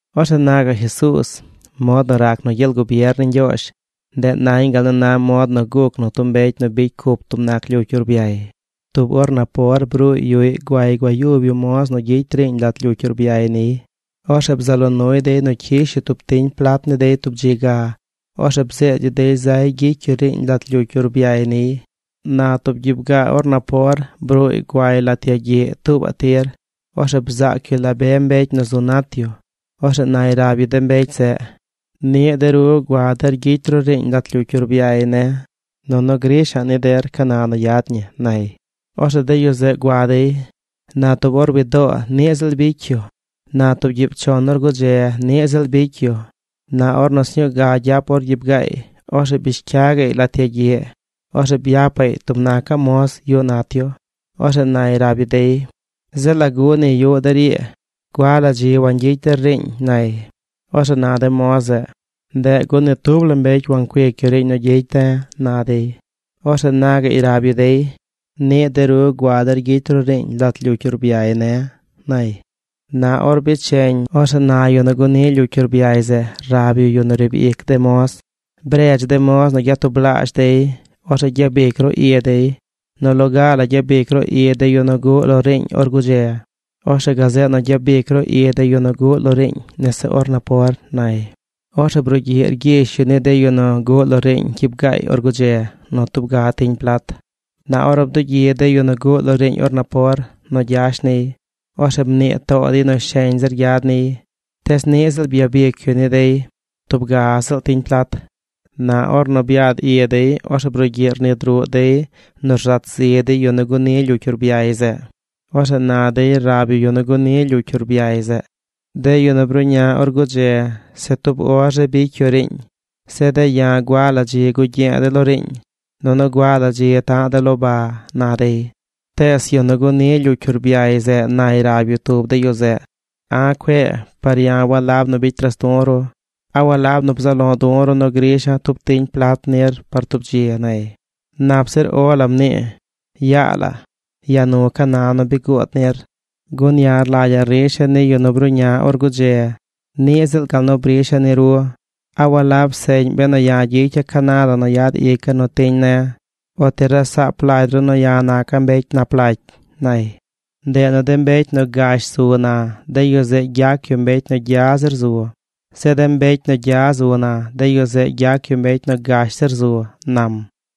Orzeꞌ na gaꞌ Jesuuz: ―Mod nu rac nu gyel gubier ni Ñgyoozh, ndeꞌ nañ gal nu na mod nu guc nu tub mbecy nu bicy cup tub nac lyucy urbyay. Tub or napor bruuy yuꞌy guay gua yub yu moz nu gyicy yu riiñ lat lyucy urbyay niy. Orzeꞌ bzaꞌ lo nuy dey nu cyish yu tub tiñ plat ni dey tub dzi ga. Orzeꞌ bzeed yu dey zay gyicy yu riiñ lat lyucy urbyay niy. Na tub gyiib gaa or napor bruuy guay lat yagyiꞌ tuubaꞌ tir. Orzeꞌ bzaac yu la be mbecy nu zu nat yu. Orzeꞌ nay rab yu de mbecy zeꞌ: “Niꞌ de ru gua der gyicy ru riiñ lat lyucy urbyay ne̱, nunu grisha̱ꞌ ni der ca na nu yad ñi”, nay. Orzeꞌ de yu zeꞌ gua dey. Na tub or wi doo niꞌ ziꞌl bicy yu. Na tub gyiib chon or gudze, niꞌ ziꞌl bicy yu. Na ornu sñuu ga gyap or gyiib gaay, orzeꞌ bish cya gaꞌy lat yagyiꞌ. Orzeꞌ byapaꞌy tub nacaꞌ moz yuꞌ nat yu. Orzeꞌ nay rab yu dey: “Zeꞌ ¿lagu ni yuꞌ der ii? ¿Gua la dzi wangyicy der riiñ?” nay. Orzeꞌ na de moz zeꞌ: “Ndeꞌ gun ni tub la mbecy wancuic yu riiñ nu gyicy de̱”, na dey. Orzeꞌ na gaꞌy rab yu dey: “Niꞌ de ru gua der gyicy ru riiñ lat lyucy urbyay ne̱”, nay. ’Na or becheñ, orzeꞌ na yu nu guni lyucy urbyay zeꞌ rab yu yu nu riib ic de moz: “Bredz de moz nu gyatublaazh dey. Orzeꞌ gyabic ru i dey. Nu loga la gyabic ru i de yu nu guꞌ lo riiñ or gudze. Orzeꞌ gazeꞌ nu gyabic ru i de yu nu guꞌ lo riiñ nese or napor”, nay. Orzeꞌ brugyiꞌ rgyish yu ni de yu nu guꞌ lo riiñ gyiib gaay or gudze nu tub ga tiñ plat. Na ornu bdugyi de yu nu guꞌ lo riiñ or napor nu gyash niy, orzeꞌ mnii too dey nu sheñ zir gyad niy. Tees niꞌ ziꞌl byabic yu ni dey tub ga ziꞌl tiñ plat. Na ornu byad i dey, orzeꞌ brugyiꞌ rnid ruꞌ dey nu rzat zi dey yu nu guni lyucy urbyay zeꞌ. Orzeꞌ na dey rab yu yu nu guni lyucy urbyay zeꞌ: “De yu nu bruꞌña or gudze se tub or zi bicy yu riiñ. Zeꞌ de̱ ya̱ gua la dzi gugye̱e̱ de̱ lo riiñ, nunu gua la dzi taꞌ de̱ lo ba”, na dey. Tees yu nu guni lyucy urbyay zeꞌ nay rab yu tub de yu zeꞌ: “A̱ cue, par ya̱ walab nu bicy ras du̱ ru. ¿A walab nu bzaꞌ lo du̱ ru nu grisha̱ tub tiñ plat nir par tub dzi?” nay. “Nap zir O la mnii. Yaa la, yaa nu ca na la nu bi guud nir, gun ya̱ rlagya̱ risha̱ ni yu nu bruꞌña or gudze niꞌ ziꞌl gal nu brisha̱ ni ru. ¿A walab seꞌñ benu ya̱ gyicya̱ ca na la nu yad ica̱ nu tiñ ne̱? ¿O ti rasaap lagy ru nu ya̱ naca̱ mbecy nap lagy?” nay. ’Ndeꞌ nu de mbecy nu gash zu na, de yu zeꞌ gyac yu mbecy nu gya zir zu. Zeꞌ de mbecy nu gya zu na, de yu zeꞌ gyac yu mbecy nu gash zir zu ―nam.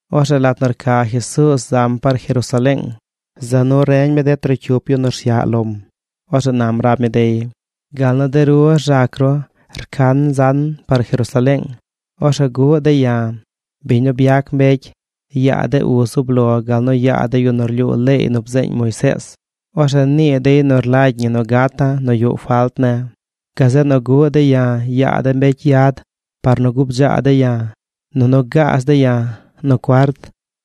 Orzeꞌ lat nu rca Jesuuz zam par Jerusaleeng, za nu reñ mi de trocyup yu nu rsyaꞌ lom. Orzeꞌ nam rab mi dey: ―Gal nu de ru rzac ru, rcan zan par Jerusaleeng. Orzeꞌ guꞌ dey ya̱, biñ nu byac mbecy, yaa de uz zub lo gal nu yaa de yu nu rlyuu leey nu bzeeñ Moisees. Orzeꞌ nii dey nu rlagy ñi nu gata̱ nu yuꞌ falt ne̱. Gazeꞌ nu guꞌ dey ya̱ yaa de mbecy yad par nu gubdzaa dey ya̱, nunu gaaz dey ya̱ nu cuart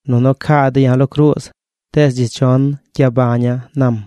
nunu caa dey ya̱ lo cruuz. Tees dzi chon gyabaña̱ ―nam.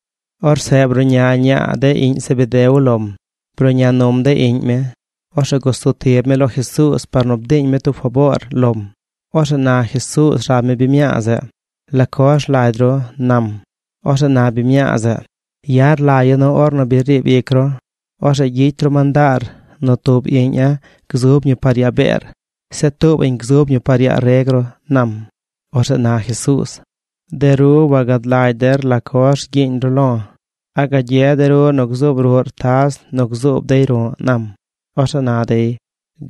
Orzeꞌ bruꞌña ñaa de iꞌñ Zebedeo lom. Bruꞌña num de iꞌñ mi. Orzeꞌ gusub tib mi lo Jesuuz par nu bdiiñ mi tub faboor lom. Orzeꞌ na Jesuuz rab mi biñ mñaa zeꞌ: ―¿La coz rlagy ru? ―nam. Orzeꞌ na biñ mñaa zeꞌ: ―Ya̱ rlagya̱ nu ornu bi riib ic ru, orzeꞌ gyicy ru mandaar nu tub iꞌña̱ gzub ñi par yaa beer, Zeꞌ tuubaꞌñ gzub ñi par yaa reg ru ―nam. Orzeꞌ na Jesuuz: ―De ru wagad lagy der la coz rgyiiñ ru lo̱. ¿A gagye de ru nu gzuub ruꞌr taz nu gzuub dey ru̱ꞌ? ―nam. Orzeꞌ na dey: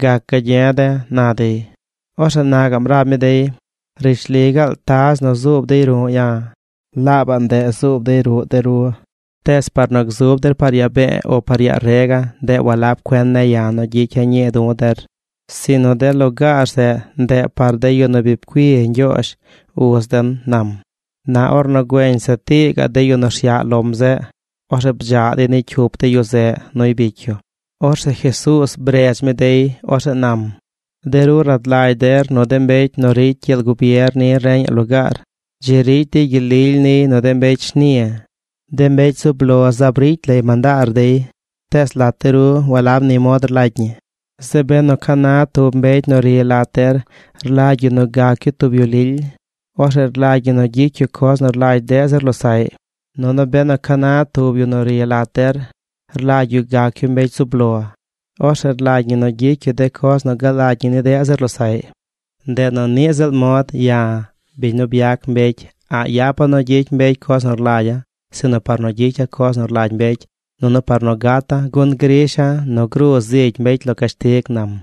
―Gac gagye̱ de̱ ―na dey. Orzeꞌ na gaꞌm rab mi dey: ―Rishli gaal taz nu zuub dey ru̱ꞌ ya̱, laabaꞌ ndeꞌ zuub dey ruꞌ de ru. Tees par nu gzub der par yaa be̱e̱ o par yaa rega̱, ndeꞌ walab cuen ne̱ ya̱ nu gyicya̱ ñii du̱ der; sinu de lugaar zeꞌ, ndeꞌ par de yu nu bi pcui Ñgyoozh, uz den ―nam. Na ornu güeñ se tii gaꞌ de yu nu rsyaꞌ lom zeꞌ, orzeꞌ bdzaꞌ dey ni cyup de yu zeꞌ nuy bicy yu. Orzeꞌ Jesuuz bredz mi dey. Orzeꞌ nam: ―De ru rad lagy der nu de mbecy nu ricy gyel gubier ni reñaꞌ lugaar, dzi ricy dey gyel lily niy nu de mbecy shni. De mbecy zub lo zaab ricy lay mandaar dey. Tees lat de ru walab ni mod rlagy ñi. Zeꞌ benu ca na tub mbecy nu ri lat der rlagy yu nu gac yu tub yu lily, orzeꞌ rlagy ñi nu gyicy yu coz nu rlagy deꞌ zir losaꞌy. Nunu benu ca na tub yu nu ri lat der rlagy yu gac yu mbecy zub lo, orzeꞌ rlagy ñi nu gyicy yu de coz nu galagy ñi ni deꞌ zir losaꞌy. Ndeꞌ nu niꞌ ziꞌl mod ya̱, biñ nu byac mbecy, a̱ꞌ yapa̱ nu gyicy mbecy coz nu rlagya̱, sinu par nu gyicya̱ coz nu rlagy mbecy nunu par nu gata̱, gun grisha̱ nu gruu zigy mbecy lo cashtig ―nam.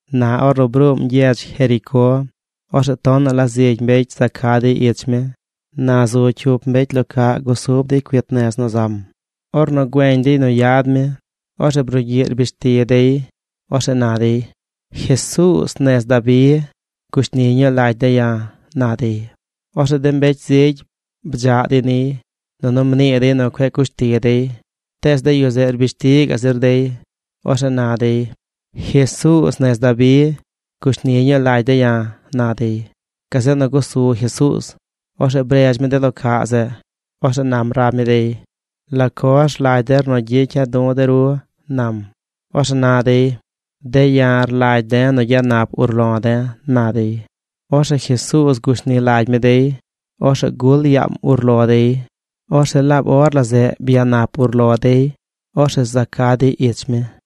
Na ornu bruum gyedz Jericó, orzeꞌ tonaꞌ la zigy mbecy za ca dey ich mi. Na zu cyup mbecy lo caꞌ gusub dey cuit nez nu zam. Ornu güeñ dey nu yad mi, orzeꞌ brugyiꞌ rbish ti dey. Orzeꞌ na dey: ―¡Jesuuz nez Dabi, gushni ñuu lagy de̱ ya̱! ―na dey. Orzeꞌ de mbecy zigy bdzaꞌ dey niy, nunu mnii dey nu cueꞌ cush ti dey. Tees de yu zeꞌ rbish ti gaꞌ zir dey. Orzeꞌ na dey: ―¡Jesuuz nez Dabi, gushni ñuu lagy de̱ ya̱! ―na dey. Gazeꞌ nu gusu Jesuuz. Orzeꞌ bredz mi de lo caꞌ zeꞌ. Orzeꞌ nam rab mi dey: ―¿La coz rlagy der nu gyicya̱ du̱ de ru? ―nam. Orzeꞌ na dey: ―De̱ ya̱ rlagy de̱ nu gyanap urlo de̱ ―na dey. Orzeꞌ Jesuuz gushni lagy mi dey. Orzeꞌ gul yaam urlo dey. Orzeꞌ laab or la zeꞌ byanap urlo dey. Orzeꞌ za ca dey ich mi.